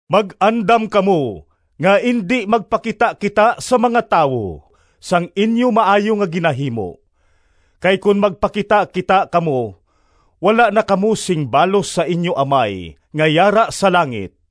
“Mag-andam kamo nga indi magpakitakita sa mga tawo sang inyo maayo nga ginahimo. Kay kon magpakitakita kamo wala na kamo sing balos sa inyo Amay nga yara sa langit.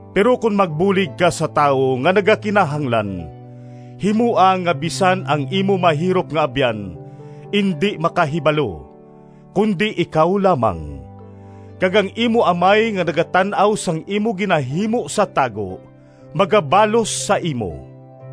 Pero kon magbulig ka sa tawo nga nagakinahanglan, himoa nga bisan ang imo mahirop nga abyan indi makahibalo, kundi ikaw lamang. Kag ang imo Amay nga nagatan-aw sang imo ginahimo sa tago magabalos sa imo.”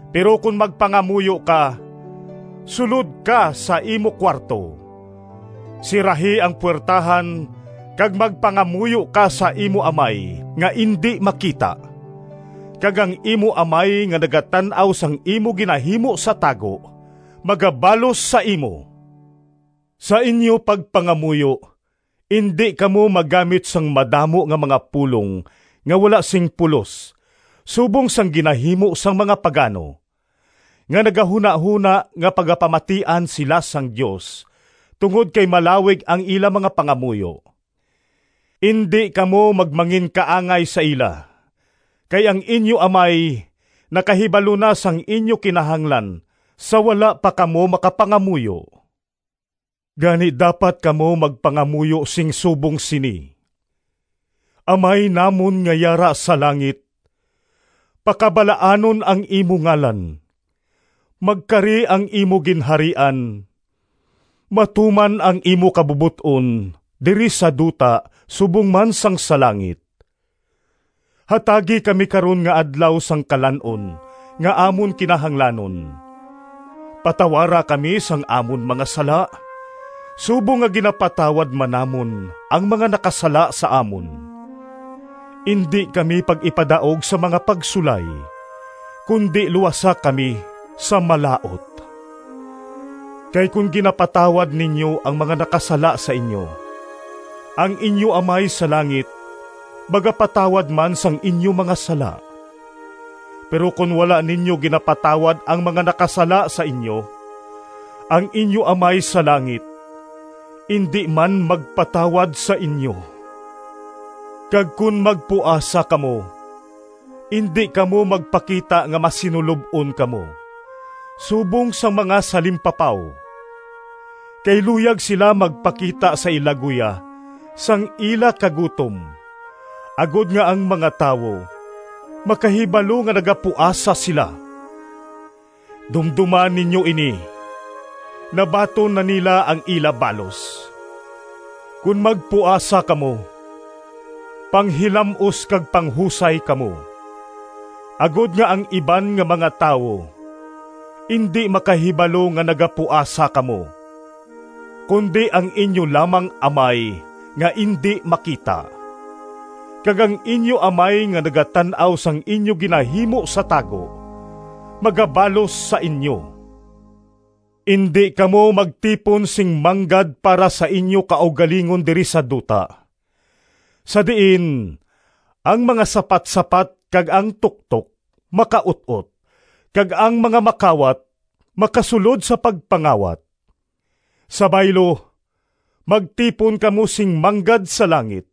Pero kon magpangamuyo ka, sulod ka sa imo kuwarto, sirahi ang puwertahan kag magpangamuyo ka sa imo Amay nga indi makita. Kag ang imo Amay nga nagatan-aw sang imo ginahimo sa tago magabalos sa imo. “Sa inyo pagpangamuyo indi kamo maggamit sang madamo nga mga pulong nga wala sing pulos subong sang ginahimo sang mga pagano, nga nagahunahona nga pagapamatian sila sang Dios tungod kay malawig ang ila mga pangamuyo. Indi kamo magmanginkaangay sa ila, kay ang inyo Amay nakahibalo na sang inyo kinahanglan sa wala pa kamo makapangamuyo. Gani dapat kamo magpangamuyo sing subong sini: ‘Amay namon nga yara sa langit, Pakabalaanon ang imo ngalan, Magkari ang imo Ginharian, Matuman ang imo kabubot-on Diri sa duta Subong man sang sa langit. Hatagi kami karon nga adlaw Sang kalan-on Nga amon kinahanglanon, Patawara kami sang amon mga sala, Subong nga ginapatawad man namon Ang mga nakasala sa amon. Indi kami pag-ipadaog Sa mga pagsulay, Kundi luwasa kami sa Malaut.’ “Kay kon ginapatawad ninyo ang mga nakasala sa inyo, ang inyo Amay sa langit magapatawad man sang inyo mga sala. Pero kon wala ninyo ginapatawad ang mga nakasala sa inyo, ang inyo Amay sa langit indi man magpatawad sa inyo.” “Kag kon magpuasa kamo, indi kamo magpakita nga masinulob-on kamo subong sang mga salimpapaw, kay luyag sila magpakita sa ila guya sang ila kagutom agod nga ang mga tawo makahibalo nga nagapuasa sila. Dumdoma ninyo ini! Nabaton na nila ang ila balos. Kon magpuasa kamo, panghilam-os kag panghusay kamo, agod nga ang iban nga mga tawo indi makahibalo nga nagapuasa kamo, kundi ang inyo lamang Amay nga indi makita. Kag ang inyo Amay nga nagatan-aw sang inyo ginahimo sa tago magabalos sa inyo.” “Indi kamo magtipon sing manggad para sa inyo kaugalingon diri sa duta, sa diin ang mga sapatsapat kag ang tuktok makaut-ot kag ang mga makawat makasulod sa pagpangawat. Sa baylo, magtipon kamo sing manggad sa langit,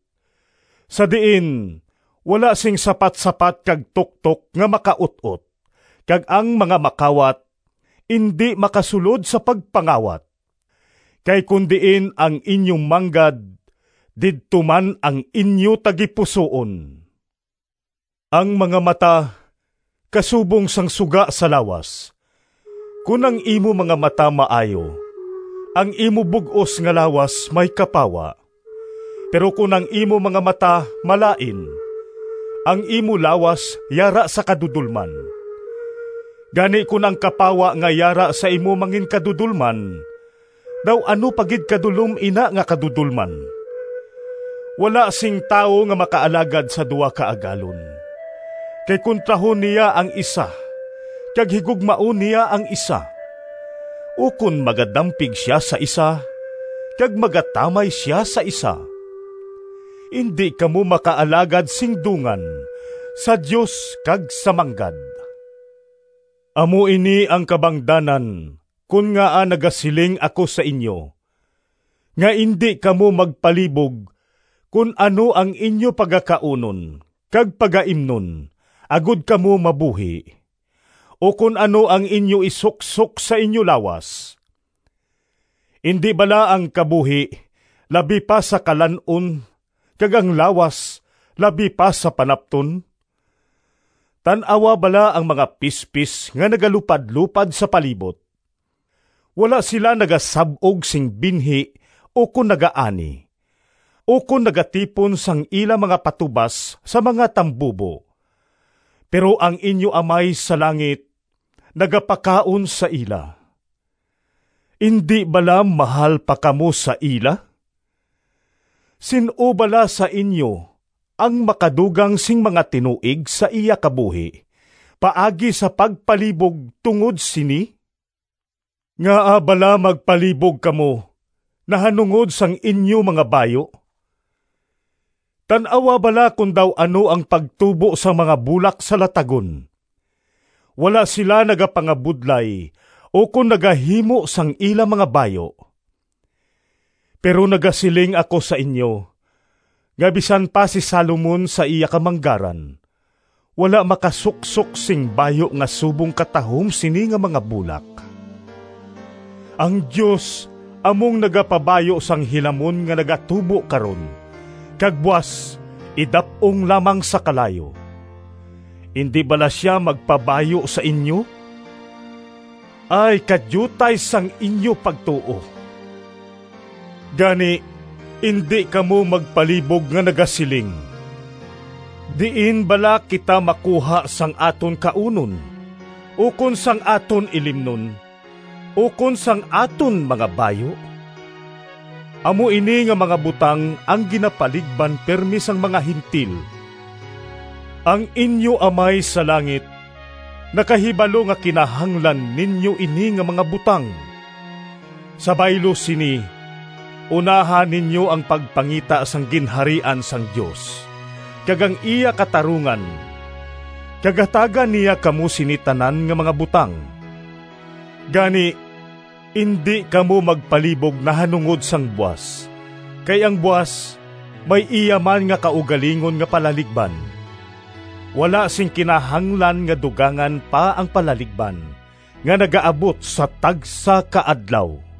sa diin wala sing sapatsapat kag tuktok nga makaut-ot kag ang mga makawat indi makasulod sa pagpangawat. Kay kon diin ang inyo manggad didto man ang inyo tagipusoon.” “Ang mga mata kasubong sang suga sa lawas. Kon ang imo mga mata maayo, ang imo bug-os nga lawas may kapawa. Pero kon ang imo mga mata malain, ang imo lawas yara sa kadudolman. Gani kon ang kapawa nga yara sa imo manginkadudolman, daw ano pa gid kadulom ina nga kadudolman!” “Wala sing tawo nga makaalagad sa duha ka agalon. Kay kontrahon niya ang isa kag higugmaon niya ang isa, ukon magadampig sia sa isa kag magatamay sa isa. Indi kamo makaalagad sing dungan sa Dios kag sa manggad. “Amo ini ang kabangdanan kon ngaa nagasiling ako sa inyo nga indi kamo magpalibog kon ano ang inyo pagakaunon kag pagaimnon agod kamo mabuhi, ukon ano ang inyo isuksok sa inyo lawas. Indi bala ang kabuhi labi pa sa kalan-on kag ang lawas labi pa sa panapton? Tan-awa bala ang mga pispis nga nagalupadlopad sa palibot. Wala sila nagasab-og sing binhi ukon nagaani, ukon nagatipon sang ila mga patubas sa mga tambubo, pero ang inyo Amay sa langit nagapakaon sa ila! Indi bala mahal pa kamo sa ila? Sin-o bala sa inyo ang makadugang sing mga tinuig sa iya kabuhi paagi sa pagpalibog tungod sini? “Ngaa bala magpalibog kamo nahanungod sang inyo mga bayu? Tan-awa bala kon daw ano ang pagtubo sang mga bulak sa latagon; wala sila nagapangabudlay ukon nagahimo sang ila mga bayu. Pero nagasiling ako sa inyo nga bisan pa si Salomon sa iya kamanggaran wala makasuksok sing bayu nga subong katahom sini nga mga bulak. Ang Dios amo ang nagapabayu sang hilamon nga nagatubo karon kag buas idap-ong lamang sa kalayo. Indi bala sia magpabayu sa inyo? Ay kadiutay sang inyo pagtuo! Gani indi kamo magpalibog nga nagasiling, ‘Diin bala kita makuha sang aton kaunon, ukon sang aton ilimnon, ukon sang aton mga bayu?’ (Amo ini nga mga butang ang ginapaligban pirme sang mga Gentil.) Ang inyo Amay sa langit nakahibalo nga kinahanglan ninyo ini nga mga butang. Sa baylo sini, unaha ninyo ang pagpangita sang Ginharian sang Dios kag ang iya katarungan kag hatagan niya kamo sini tanan nga mga butang. Gani indi kamo magpalibog nahanungod sang buas, kay ang buas may iya man nga kaugalingon nga palaligban. Wala sing kinahanglan nga dugangan pa ang palaligban nga nagaabot sa tagsa ka adlaw.”